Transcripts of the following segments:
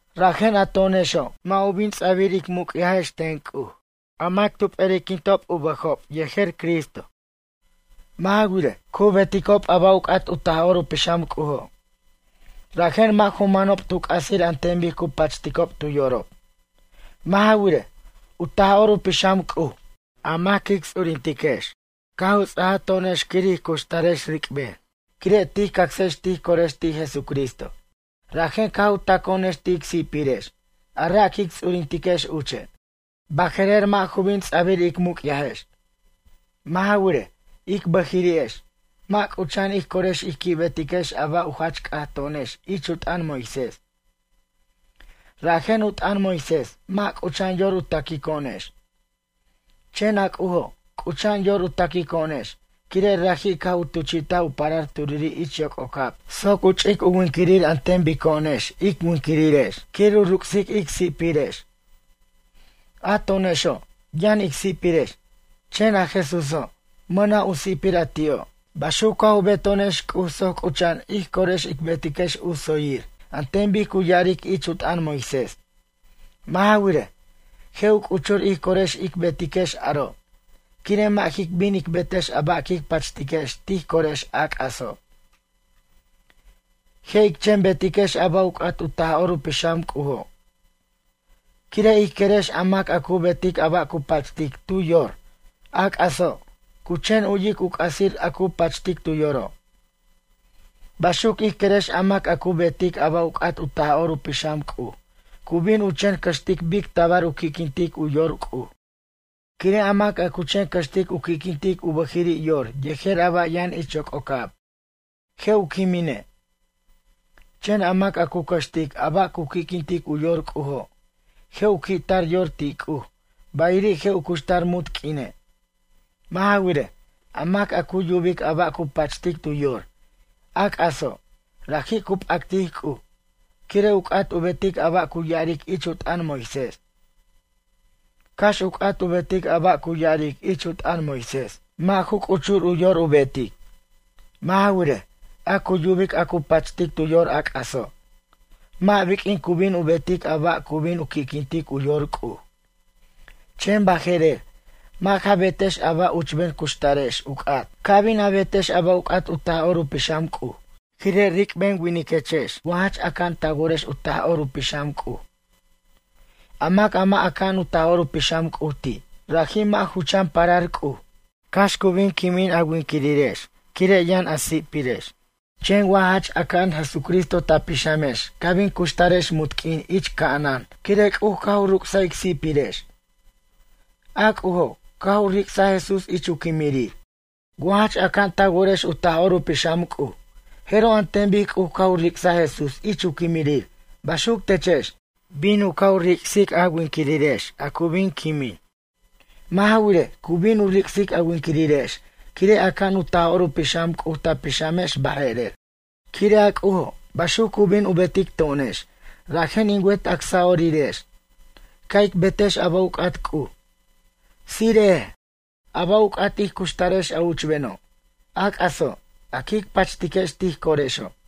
Rajen a to'onexo', mʌ' u bin ts'abir ic muc'yajex ten C'uj, a mac tu p'eri'quintob u bʌjob yejer Cristo. Mʌ' ja wirej, cu beticob a ba' u c'at u Taj'or u Pixam C'ujo'. Rajen mʌ' ju manob tu c'asir an ten bic cu pachticob tu yorob. Mʌ' ja wirej, u Taj'or u Pixam C'uj, a mac quic ts'urintiquex caj u ts'aj to'onex quir ij cuxtarex ric'ben, quire' tij cacsex tij corex ti' Jesucristo. Rajen caj u taco'onex ti' ic si'pirex, a ra' quic ts'urintex uche'. Baje'rer, mʌ' ju bin ts'abir ic muc'yajex. Mʌ' ja wirej, ic bʌjiri'ex, mʌ' c'ucha'an ij corex ij qui' betiquex a ba' u jach c'at to'onex ich u t'ʌn Moisés. Rajen u t'ʌn Moisés, mʌ' c'ucha'an yor u taquico'onex. Chen a C'ujo', c'ucha'an yor u taquico'onex, quire' raji' caj u tuchi'taj u parar turiri' ich yoc'ocab soc u ch'ic u winquirir an ten bico'onex ic winquirirex, quir u ruc'sic ic si'pirex. A to'onexo', yʌn ic si'pirex, chen a Jesúso', mʌna' u si'pir a ti'o'. Baxuc caj u beto'onex C'uj soc c'ucha'an ij corex ic betiquex u tsoyir, an ten bic cu ya'aric ich u t'ʌn Moisés. Mʌ' ja wirej, je' u c'uchur ij corex ic betiquex aro', quire' mʌ' jic bin ic betex a ba' quic pachtiquex tij corex a c'aso'. Je' ic chen betiquex a ba' u c'at u Taj'or u Pixam C'ujo'. Quire' ij querex a mac a cu betic a ba' cu pachtic tu yor, a c'aso', cu chen u'yic u c'asir a cu pachtic tu yoro'. Baxuc ij querex a mac a cu betic a ba' u c'at u Taj'or u Pixam C'uj cu bin u chen cʌxtic bic tabar u qui'quintic u yor C'uj. Quire' a mac a cu chen cʌxtic u qui'quintic u bʌjiri' yor yejer a ba' yʌn ich yoc'ocab, je' u quimine'. Chen a mac a cu cʌxtic a ba' cu qui'quintic u yor C'ujo', je' u qui'tar yor ti' C'uj, bayiri' je' u cuxtar munt q'uine'. Mʌ' ja wirej, a mac a cu yubic a ba' cu pachtic tu yor, a c'aso', raji' cu p'actic C'uj, quire' u c'at u betic a ba' cu ya'aric ich u t'ʌn Moisés. Cax u c'at u betic a ba' cu ya'aric ich u t'ʌn Moisés, mʌ' ju c'uchur u yor u betic. Mʌ' ja wirej, a cu yubic a cu pachtic tu yor a c'aso', mʌ' biq'uin cu bin u betic a ba' cu bin u qui'quintic u yor C'uj. Chen baje'rer, mʌ' ja betex a ba' uchben cuxtarex u c'at. Ca bin a betex a ba' u c'at u Taj'or u Pixam C'uj, quire' ric'ben winiquechex wa jach aca'an ta worex u Taj'or u Pixam C'uj. A mac a mʌ' aca'an u Taj'or u Pixam C'uji' ti', raji' mʌ' ju chan parar C'uj. Cax cu bin quimin a winquirirex quire' yʌn a si'pirex, chen wa jach aca'an Jesucristo ta pixamex ca bin cuxtarex munt q'uin ich ca'anan, quire' C'uj caj u ruc'saj ic si'pirex. A C'ujo', caj u ric'saj Jesús ich u quimirir. Wa jach aca'an ta worex u Taj'or u Pixam C'uj, jeroj an ten bic C'uj caj u ric'saj Jesús ich u quimirir, baxuc techex, bin u ca' u ric'sic a winquirirex a cu bin quimin. Mʌ' ja wirej, cu bin u ric'sic a winquirirex, quire' aca'an u Taj'or u Pixam C'uj ta pixamex baje'rer. Quire' a C'ujo', baxuc cu bin u betic to'onex, rajen in wet acsa'orirex, ca' ic betex a ba' u c'at C'uj. Tsire'ej, a ba' u c'at ij cuxtarex a uchbeno', a c'aso', a quic pachtex tij corexo'.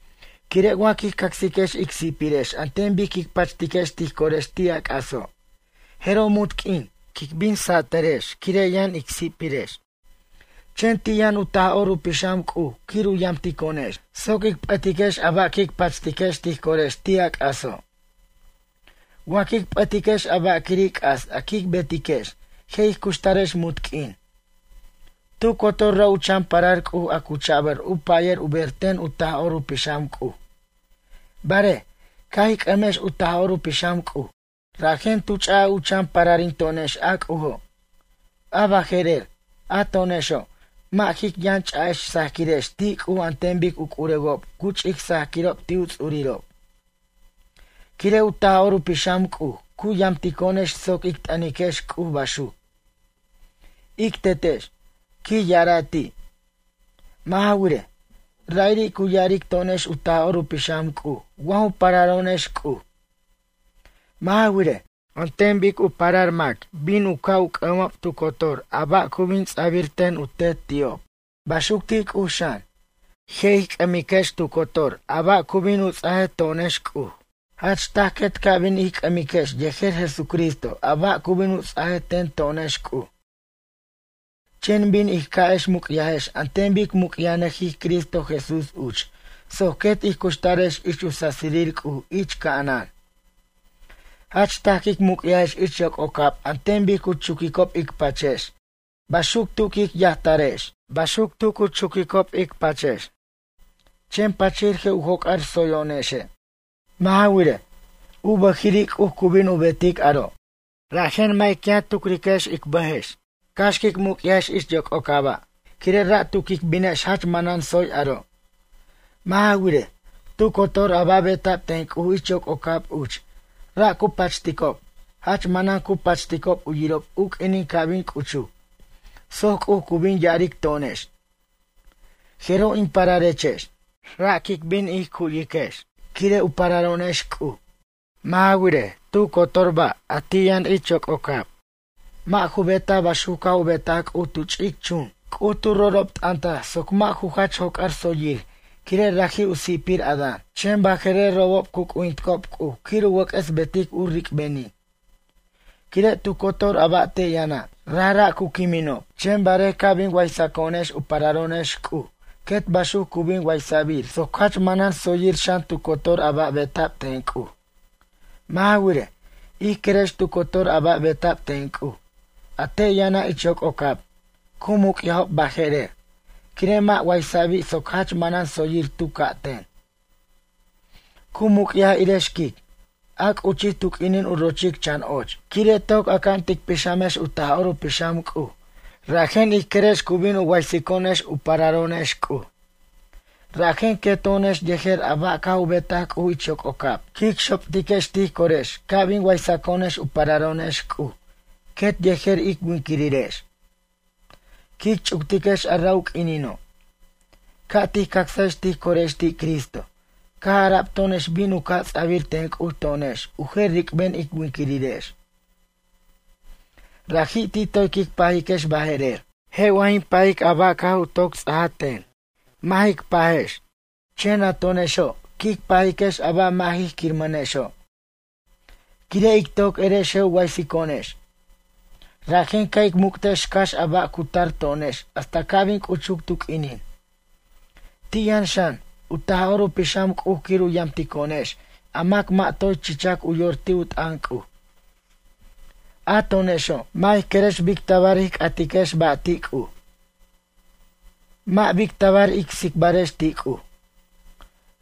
Quire' wa quij cacsiquex ic si'pirex an ten bic quic pachtiquex tij corex ti' a c'aso', jeroj munt q'uin, quic bin satʌrex quire' yʌn ic si'pirex. Chen ti' yʌn u Taj'or u Pixam C'uj quir u yamtico'onex, soc ic p'ʌtiquex a ba' quic pachtiquex tij corex ti' a c'aso'. Wa quic p'ʌtiquex a ba' quiri' c'as a quic betiquex, je' ij cuxtarex munt q'uin. Tu cotor ra' u chan parar C'uj a cu cha'bʌr u pʌyʌr u ber ten u Taj'or u Pixam C'uj. Barej, caj ij c'ʌmex u Taj'or u Pixam C'uj, rajen tu ch'u chan pararinto'onex a C'ujo'. A baje'rer, a to'onexo', mʌ' jic yʌn ch'a'ex sajquirex ti' C'uj an ten bic u c'urewob cu ch'ic sajquirob ti' u ts'urirob. Quire' u Taj'or u Pixam C'uj cu yamtico'onex soc ic t'ʌniquex C'uj baxuc: “Ic Tetex”, quij ya'ara' ti'. Mʌ' ja wirej, ra'iri' cu ya'aric to'onex u Taj'or u Pixam C'uj wa ju pararo'onex C'uj. Mʌ' ja wirej, an ten bic u parar mac bin u caj c'ʌmob tu cotor a ba' cu bin ts'abir ten u tet ti'ob. Baxuc ti' C'uj xan, je' ij c'ʌmiquex tu cotor a ba' cu bin u ts'ajej to'onex C'uj. Jach taj quet ca' bin ij c'ʌmiquex yejer Jesucristo a ba' cu bin ts'ajej ten to'onex C'uj. Chen bin ij ca'ex muc'yajex an ten bic muc'yajnʌjij Cristo Jesús uch, soc quet ij cuxtarex ich u sasirir C'uj ich ca'anan. Jach taj quic muc'yajex ich yoc'ocab an ten bic cu chuquicob ic pachex, baxuc tu quic yajtarex, baxuc tu cu chi'ob ic pachex. Chen pachir je' u joc'ar tsoyo'onexe'. Mʌ' ja wirej, u bʌjiri' C'uj cu bin u betic aro'. Rajen mʌ' ic yʌn tucrex ic bʌjex cax quic muc'yajex ich yoc'ocaba', quire' ra' tu quic binex jach manan tsoy aro'. Mʌ' ja wirej, tu cotor a ba' beta'b ten C'uj ich yoc'ocab uch, ra' cu pachticob, jach manan cu pachticob u yirob u q'uinin ca' bin c'uchuc soc C'uj cu bin ya'aric to'onex: “Jeroj in pararechex.” Ra' quic bin ij cu'yiquex, quire' u pararo'onex C'uj. Mʌ' ja wirej, tu cotor ba' a ti' yʌn ich yoc'ocab, mʌ' ju betaj baxuc caj u betaj C'uj tu ch'ic chun. C'uj tu rorobt'ʌntaj soc mʌ' ju jach joc'ar tsoyir quire' raji' u si'pir Adán. Chen baje'rer robob cu c'ujinticob C'uj quir u wʌc'ʌs betic u ric'benin. Quire' tu cotor a ba' te' yʌna', rajra' cu quiminob. Chen barej ca' bin waysaco'onex u pararo'onex C'uj, quet baxuc cu bin waysa'bir soc jach manan tsoyir xan tu cotor a ba' beta'b ten C'uj. Mʌ' ja wirej, ij querex tu cotor ba' a beta'b ten C'uj, a te' yʌna' ich yoc'ocab, cu muc'yajob baje'rer, quire' mʌ' waysa'bi' soc jach manan tsoyir tu ca' ten. Cu muc'yaj irej xquic, a c'uchij tu q'uinin u rochic chan och. Quire' toc aca'an tic pixamex u Taj'or u Pixam C'uj, rajen ij querex cu bin u waysico'onex u pararo'onex C'uj. Rajen queto'onex yejer a ba' caj u betaj C'uj ich yoc'ocab, quic xoptiquex tij corex ca' bin waysaco'onex u pararo'onex C'uj, quet yejer ic winquirirex. Quic ch'uctiquex a ra' u q'uinino'. Caj tij cacsajex tij corex ti' Cristo, caj ara'b to'onex bin u ca' ts'abir ten C'uj to'onex u jer ric'ben ic winquirirex. Raji' ti' toy quic pajiquex baje'rer. Je' wa jin pajic a ba' caj u toc ts'aja ten? Mʌ' jic pajex. Chen a to'onexo', quic pajiquex a ba' mʌ' ij quirmʌnexo', quire' ic toc erex je' u waysico'onex. Rajen ca' ic muc'tex cax a ba' a cu tar to'onex hasta ca' bin c'uchuc tu q'uinin. Ti' yʌn xan, u Taj'or u Pixam C'uj quir u yamtico'onex a mac mʌ' toy chichac u yor ti' u t'ʌn C'uj. A to'onexo', mʌ' ij querex bic tabar ij c'atiquex ba' ti' C'uj. Mʌ' bic tabar ic tsicbarex ti' C'uj.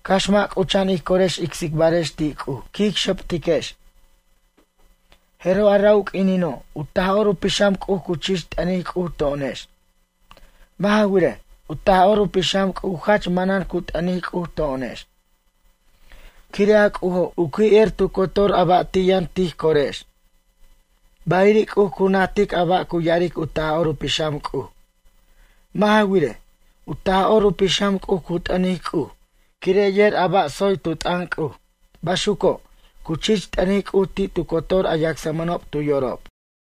Cax mʌ' c'ucha'an ij corex ic tsicbarex ti' C'uj, quic xoptiquex. Jeroj a ra' u q'uinino', u Taj'or u Pixam C'uj cu chich t'ʌnic C'uj to'onex. Mʌ' ja wirej, u Taj'or u Pixam C'uj jach manan cu t'ʌnic C'uj to'onex. Quire' a C'ujo', u qui' er tu cotor ba' a ti' yʌn tij corex, bayiri' C'uj cu najtic a ba' cu ya'aric u Taj'or u Pixam C'uj. Mʌ' ja wirej, u Taj'or u Pixam C'uj cu t'ʌnic C'uj, quire' yer a ba' tsoy tu t'ʌn C'uj, baxuco', cu chich t'ʌnic C'uj ti' tu cotor a yacsmʌnob tu yorob.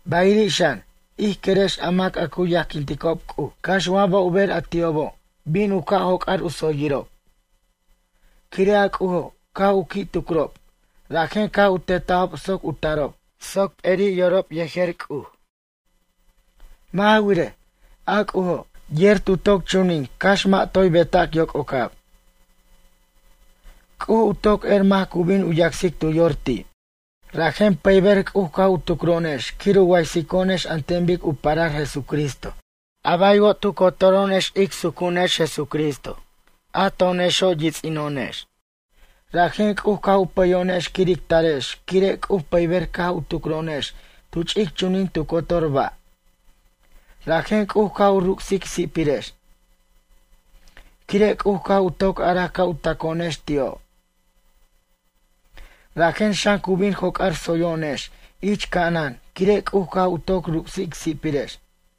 Bayiri' xan, ij querex a mac a cu yajquinticob C'uj, cax wa ba' u ber a ti'obo', bin u ca' joc'ar u tsoyirob. Quire' a C'ujo', caj u qui' tucrob, rajen caj u teta'bob soc u tarob, soc p'eri' yorob yejer C'uj. Mʌ' ja wirej, a C'ujo', yer tu toc chunin cax mʌ' toy betac yoc'ocab, C'uj u toc er mac cu bin yacsic tu yor ti'. Rajen pʌyber C'uj caj u tucro'onex quir u waysico'onex an ten bic u parar Jesucristo, a baywo' tu cotoro'onex ic sucu'unex, Jesucristo a to'onexo' yits'ino'onex. Rajen C'uj caj u pʌyo'onex quir ic tarex quire' C'uj pʌyber caj u tucro'onex tu ch'ic chunin tu cotor ba'. Rajen C'uj caj u ruc's ic si'pirex, quire' C'uj caj u toc araj ca' u taco'onex ti'o'. Rajen xan cu bin u joc'ar tsoyo'onex ich ca'anan quire' C'uj caj u toc ruc's ic si'pirex.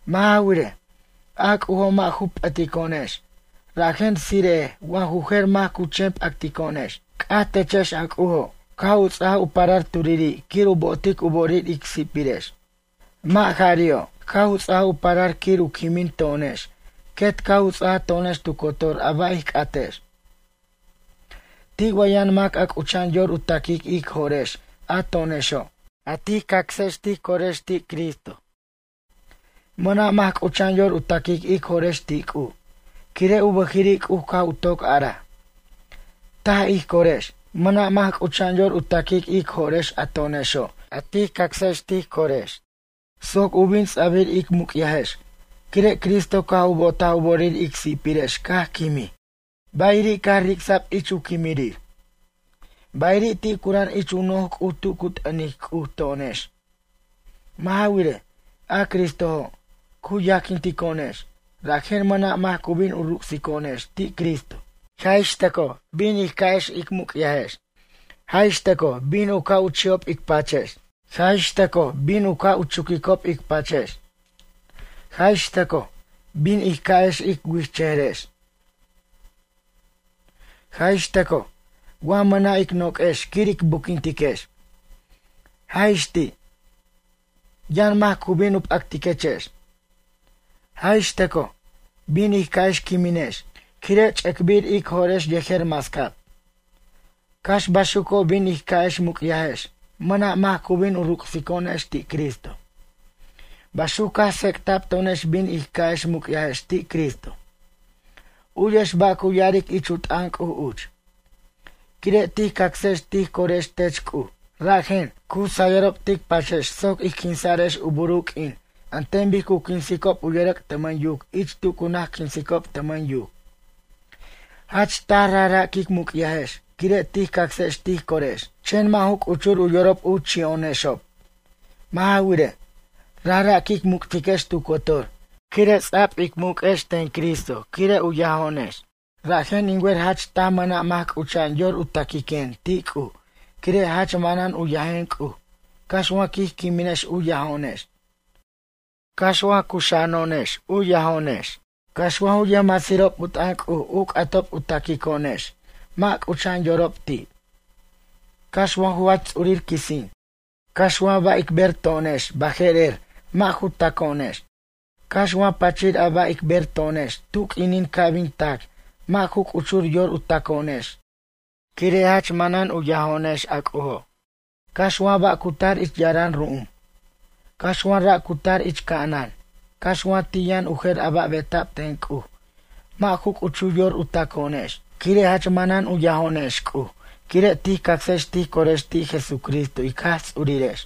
Mʌ' ja wirej, a C'ujo' mʌ' ju p'ʌtico'onex, rajen tsire'ej wa ju jer mac cu chen p'actico'onex. C'aj techex a C'ujo', caj u ts'aj u parar turiri' quir u bo'otic u bo'orir ic si'pirex. Mʌ' jari'o', caj u ts'aj u parar quir u quimin to'onex, quet caj u ts'ajaj to'onex tu cotor a ba' ij c'atex. Ti' wa yʌn mac a c'ucha'an yor u taquic ic jo'rex a to'onexo', a tij cacsex tij corex ti' Cristo? Mʌna' mac c'ucha'an yor u taquic ic jo'rex ti' C'uj, quire' u bʌjiri' C'uj caj u toc araj: “Taj ij corex.” Mʌna' mac c'ucha'an yor u taquic ic jo'rex a to'onexo', a tij cacsex tij corex soc u bin ts'abir ic muc'yajex, quire' Cristo caj u bo'otaj u bo'orir ic si'pirex caj quimij, bayiri' caj ric'sa'b ich u quimirir. Bayiri' ti' cura'an ich u noj C'uj tu cu t'ʌnic C'uj to'onex. Mʌ' ja wirej, a Cristojo', cu yajquintico'onex, rajen mʌna' mac cu bin u ruc'sico'onex ti' Cristo. Jaj ix tʌcoj, bin ij ca'ex ic muc'yajex. Jaj ix tʌcoj bin u ca' u chi'ob ic pachex. Jaj ix tʌcoj bin u ca' u chuquicob ic pachex. Jaj ix tʌcoj, bin ij ca'ex ic wi'ijchʌjʌrex. Jaj ix tʌcoj, wa mʌna' ic noq'uex quir ic buquintiquex. Jaj ix ti', yʌn mac cu bin p'actiquechex. Jaj ix tʌcoj, bin ij ca'ex quiminex, quire' ch'ʌc'bir ic jo'rex yejer mascab. Cax baxuco' bin ij ca'ex muc'yajex, mʌna' mac cu bin u ruc'sico'onex ti' Cristo. Baxuc caj tsec'ta'b to'onex bin ij ca'ex muc'yajex ti' Cristo. U'yex ba' cu ya'aric ich u t'ʌn C'uj uch: Quire' tij cacsajex tij corex tech C'uj, rajen, cu sayʌrob tic pachex soc ij quinsa'rex u buru q'uin an ten bic cu quinsicob u yʌrʌc' tʌmʌn yuc ich tu cu naj quinsicob tʌmʌn yuc. Jach taj rajra' quic muc'yajex, quire' tij cacex tij corex, chen mʌ' ju c'uchur u yorob u chi'o'onexob. Mʌ' ja wirej, rajra' quic muc'tiquex tu cotor, quire' ts'a'b ic muq'uex ten Cristo quire' u yajo'onex. Rajen, in wer jach taj mʌna' mac c'ucha'an yor u taquiquen ti' C'uj, quire' jach manan u yajen C'uj, cax wa quij quiminex u yajo'onex. Cax wa cuxa'ano'onex cu yajo'onex. Cax wa ju yʌjmasirob u t'ʌn C'uj u c'atob u taquico'onex, mʌ' c'ucha'an yorob ti'. Cax wa ju jach ts'urir quisin. Cax wa ba' ic ber to'onex baje'rer, mʌ' ju taco'onex. Cax wa pachir a ba' ic ber to'onex tu q'uinin ca' bin tac, mʌ' ju c'uchur yor u taco'onex quire' jach manan cu yajo'onex a C'ujo'. Cax wa ba' cu tar ich yara'an ru'um. Cax wa ra' cu tar ich ca'anan, cax wa ti' yʌn u jer a ba' a beta'b ten C'uj, mʌ' ju c'uchur yor u taco'onex, quire' jach manan u yajo'onex C'uj quire' tij cacsex tij corex ti' Jesucristo ic Jaj Ts'urirex.